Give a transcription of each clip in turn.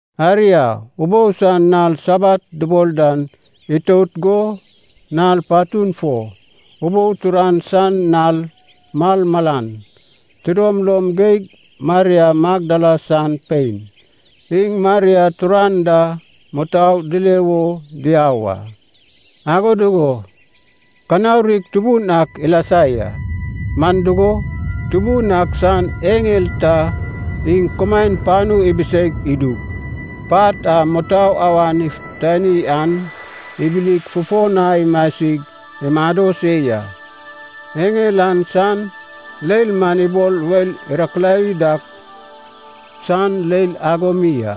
Aria, ubou san nal Sabat dubol dan itout go nal patun fo, ubou turan san nal malmalan, tidom lom geig Maria Magdala san pein, iŋ Maria turan da mutou dile wo diau a. Ago dugo kanaurig tubun ak ilasa ya. Man dugo, Tubun ak san eŋel ta iŋ kumaen panu ibiseig idug, pat a mutou awan ifutani an ibilig fufo na imasig imado se ya. Eŋel an san leil man ibol weil irakilawi dak san leil ago mi a,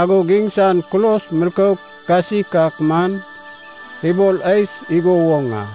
agod iŋsan kulos milkouk kasik man ibol ais igo woŋ a.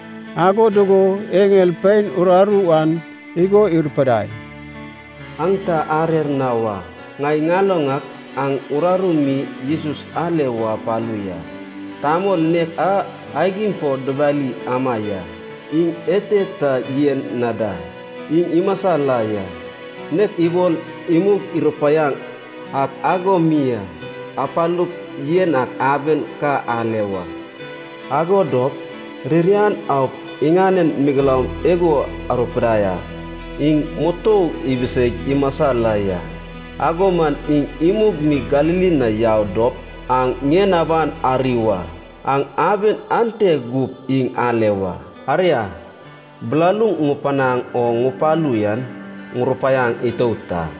Ago dugo eŋel pein uraru an igo irupidai, “Aŋ ta arer na wa. Ŋai ŋaloŋ ak aŋ uraru mi Jesus ale wo apalu ya, tamol nek a aigim fo dubali ama ya. Iŋ ete ta yen na da, iŋ imasa la ya, nek ibol imug irupaiaŋ ak ago mi a. Apalup yen ak aben ka ale wa. Ago dop ririan aup iŋanen megeloum igo arupidai a. ‘Iŋ mutou ibiseig imasa la ya. Ago man iŋ imug mi Galili na yau dop aŋ ŋien aban ari wa, aŋ aben ante gup iŋ ale wa.’ Aria, bilaluŋ ŋupanaŋ o ŋupalu yan ŋurupaiaŋ itout a.”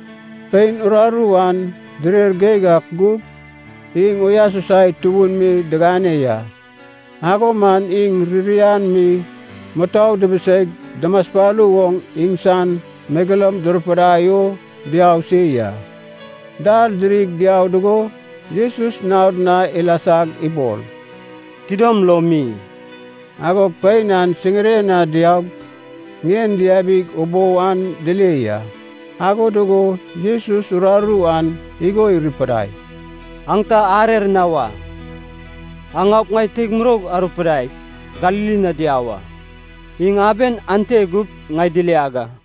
Pein uraru an direr geig ak gug, iŋ uyasusai tubun mi digane ya. Ago man iŋ ririan mi mutou dubuseig dumaspalu oŋ iŋsan megeloum durupidai o diau se ya. Dal dirig diau dugo Jesus naod na ilasag ibol, “Tidom lom mi!” Agog pein an siŋiren na diaug ŋien diabig ubou an dile ya. Ago dugo Jesus uraru an igo irupidai, “Aŋ ta arer na wa, aŋ aup ŋai teig muroug arupidaip Galili na diau a. Iŋ aben ante gup ŋai diliag a.”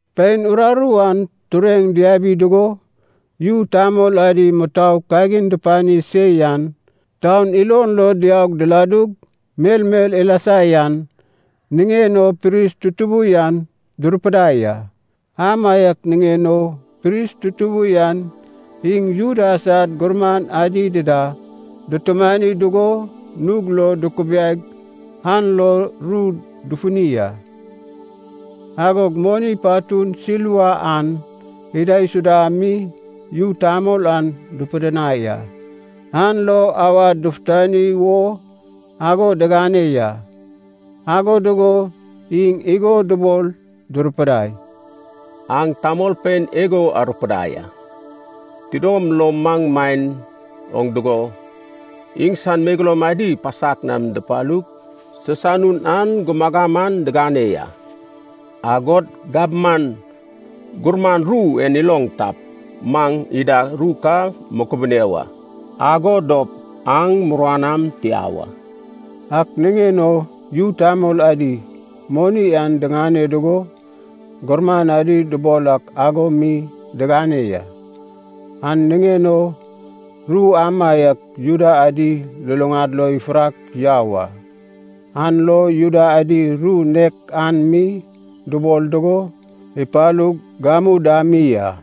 Pein uraru an tureŋ diabi dugo, yu tamol adi mutou kagin dupani se yan, taun ilon lo diaug diladug melmel ilasa yan, niŋen o pris tutubu yan durupidai a. Amaiak niŋen o pris tutubu yan iŋ Juda sad gurman adi dida dutumani dugo nug lo dukubiaig an lo ru dufuni a. Agog moni patun silva an idaisuda mi yu tamol an dupidinai a. An lo awad dufutani wo ago digane ya. Ago dugo iŋ igo dubol durupidai, “Aŋ tamolpein igo arupidai a. ‘Tidom lo maŋ maen oŋ dugo, iŋsan megeloum adi pasak nam dupalug sisanun an gumagam an digane ya.’ Agod gabman gurman ru en iloŋ tap, maŋ ida ru ka mukubune wa, ago dop aŋ muruan am tia wa.” Ak niŋen o yu tamol adi, moni an diŋane dugo, gurman adi dubol ak ago mi digane ya. An niŋen o ru amaiak Juda adi luluŋad lo ifurak yau a, an lo Juda adi ru nek an mi dubol dugo ipalug gamu da mi a.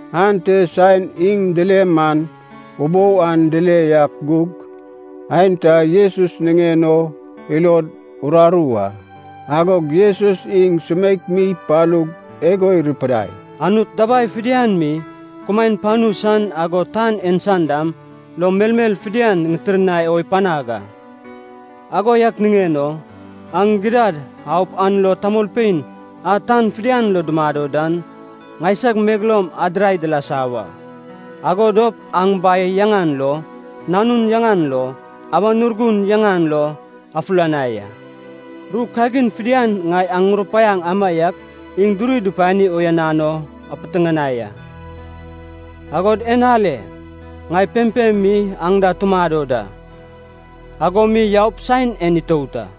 Ante saen iŋ dile man, ubou an dile yak gug, aenta Jesus niŋen o ilod uraru a. Agog Jesus iŋ sumeik mi ipalug igo irupidai, “Anut dabai fidian mi, kumaen panu san, agod tan en san dam, lo melmel fidian ŋitirnai o ipanag a. Ago yak niŋen o, aŋ gidad aup an lo tamolpein a tan fidian lo dumado dan, ŋaisag megeloum adirai dilasa wa. Ago dop aŋ Bai yaŋan lo, Nanun yaŋan lo, Awan Urgun yaŋan lo afulanai a. Ru kagin fidian ŋai aŋ ŋurupaiaŋ amaiak iŋ duri dupani uyanan o apiteŋanai a. Agod en ale, ŋai pempem mi aŋ da tumado da, ago mi yaup saen en itout a.”